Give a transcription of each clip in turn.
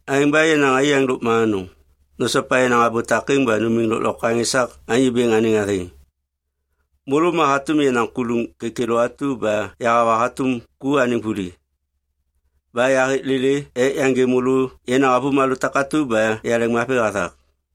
Aêŋ ba yenaŋ aiyaŋ lôkma anôŋ, nosopa yenaŋ abô takêŋ ba numiŋ lôklokwaŋ esak Anyô Bêŋ anêŋ athêŋ. Môlô ma hatôm yenaŋ kuluŋ kêkêlô atu ba yahawa hatôm ku anêŋ vuli. Ba yahêk lêlê ek yaŋgê môlô yenaŋ avômalô takatu ba yaleŋmavi hathak.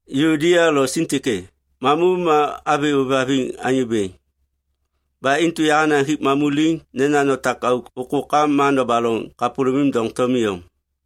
Yuodia lo Sintike, mamu ma avi ôêvhaviŋ Anyô Bêŋ. Ba intu yahanaŋ hik mamu liŋ nena notak auk ôkôkam ma nobaloŋ kapôlômim doŋtom iyom.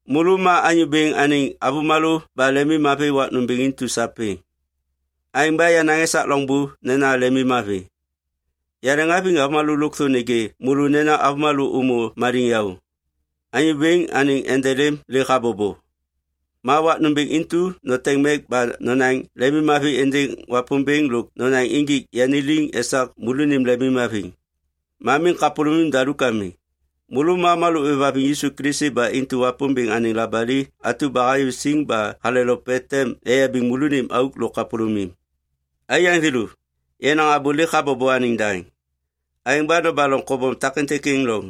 Môlô ma Anyô Bêŋ anêŋ avômalô ba lemimmavi wak nômbêŋ intu sapêŋ. Aêŋ ba yanaŋ esak loŋbô nena lemimmavi. Yaleŋhaviŋ avômalô lôkthô nêgê môlô nena avômalô ômô maliŋyaô. Anyô Bêŋ anêŋ endelêm lêk habobo. Ma wak nômbêŋ intu noteŋ mek ba nonaŋ lemimmavi êndêŋ Wapômbêŋ lôk nonaŋ injik yani liŋ esak môlônim lemimhaviŋ. Ma miŋ kapôlômim daluk ami. Môlô ma avômalô ôêvhaviŋ Yisu Kilisi ba intu Wapômbêŋ anêŋ labali atu ba hayô siŋ ba halelope tem eyabiŋ môlônim auk lôk kapôlômim. Aiyaŋ thêlô, yenaŋ abô lêk habobo anêŋ daŋ. Aêŋ ba nobaloŋ kobom takêntêk êŋ loŋ.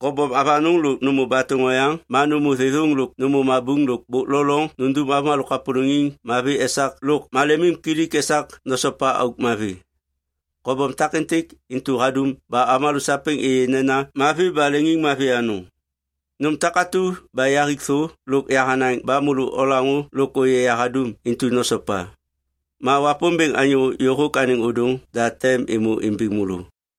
Kobom avanôŋ lôk nômô batôŋ oyaŋ ma nômô thêthôŋ lôk nômô mabuŋ lôk bôk lo loŋ nundum avômalô kapôlôŋiŋ mavi esak lôk malemimkilik esak nosopa auk mavi. Kobom takêntêk intu hadum ba avômalô sapêŋ êyê nena mavi ba leŋiŋmavi anôŋ. Nôm takatu ba yahik thô lôk yahanaŋ ba môlô olaŋô lôk ôyê yahadum intu nosopa. Ma Wapômbêŋ anyô yôhôk anêŋ ôdôŋ da tem êmô imbiŋ môlô.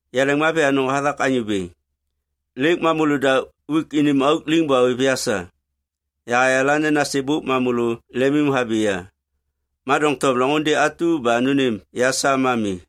Yaleŋmavi anôŋ hathak Anyô Bêŋ. Lêk ma môlôda uik unim auk liŋ ba ôêv ya sa. Yahayala nena sêbôk ma môlô lemimhabi ya, ma doŋtom loŋôndê atu ba nônêm ya sa ma mi.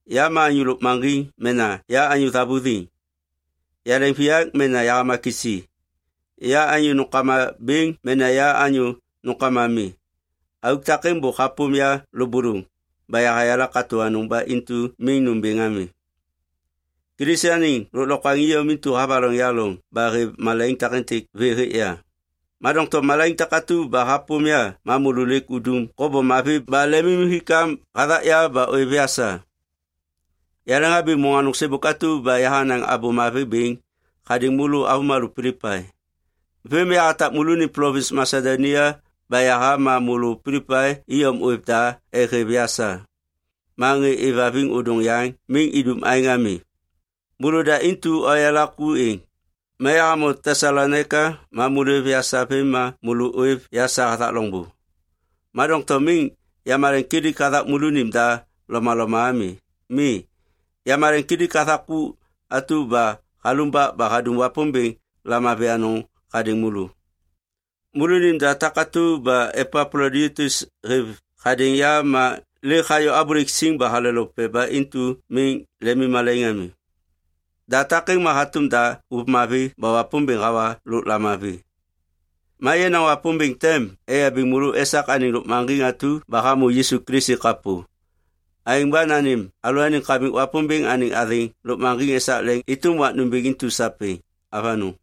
Ya anyô lôkmaŋgiŋ mena ya anyô thavuthiŋ, yaleŋviyak mena yahama kisi, ya anyô nômkama bêŋ mena ya anyô nômkama mi, auk takêŋ bôk hapôm ya lôbôlôŋ ba yahayala katô anôŋ ba intu miŋ nômbêŋ ami. Kilisi anêŋ lôklokwaŋ iyom intu havaloŋ ya loŋ ba hêv malaiŋ takêntêk vê hêk ya. Ma doŋtom malaiŋ takatu ba hapôm ya ma môlô lêk udum kobom mavi ba lemimhikam hathak ya ba ôêv ya sa. Yaleŋhabi môŋ anôŋ sêbôk atu ba yahanaŋ Abô Mavi bêŋ hadêŋ môlô avômalô Pilipai. Vêm ma yahatak môlônim plovins Masedonia ba yaha ma môlô Pilipai iyom ôêv da ek hêv ya sa ma ŋê êvhaviŋ ôdôŋ yaŋ miŋ idum aêŋ ami. Môlôda intu oyala ku êŋ. Ma yahamô Tesalonaika ma môlô ôêv ya sa vêm ma môlô ôêv ya sa hathak loŋbô. Ma doŋtom miŋ yamaleŋkilik hathak môlônim da lomaloma ami. Mi. Yamaleŋkilik hathak ku atu ba halumbak ba hadum Wapômbêŋ lamavi anôŋ hadêŋ môlô. Môlônim da takatu ba Epaploditus hêv hadêŋ ya ma lêk hayô abôlêk siŋ ba halelope ba intu miŋ lemimmalaiŋ ami. Da takêŋ ma hatôm da ôv mavi ba Wapômbêŋ hawa lôk lamavi. Ma yenaŋ Wapômbêŋ tem eyabiŋ môlô esak anêŋ lôkmaŋgiŋ atu ba hamô Yisu Kilisi kapô. Aêŋ ba nanêm alalôaniŋ Kamik Wapômbêŋ anêŋ athêŋ lôkmaŋgiŋ esak leŋ êtôm wak nômbêŋ intu sapêŋ. Avanôŋ.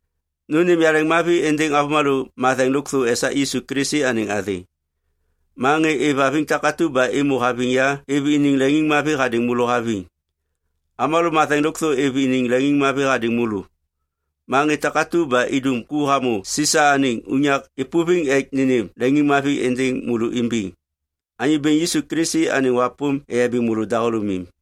Nônêm yaleŋmavi êndêŋ avômalô matheŋ lôkthô esak Yisu Kilisi anêŋ athêŋ. Ma ŋê êvhaviŋ takatu ba êmô haviŋ ya êv iniŋ leŋiŋmavi hadêŋ môlô haviŋ. Avômalô matheŋ lôkthô êv iniŋ leŋiŋmavi hadêŋ môlô. Ma ŋê takatu ba idum ku hamô Sisa anêŋ unyak êpôviŋ ek nênêm leŋiŋmavi êndêŋ môlô imbiŋ. Anyô Bêŋ Yisu Kilisi anêŋ wapôm eyabiŋ môlô dahôlômim.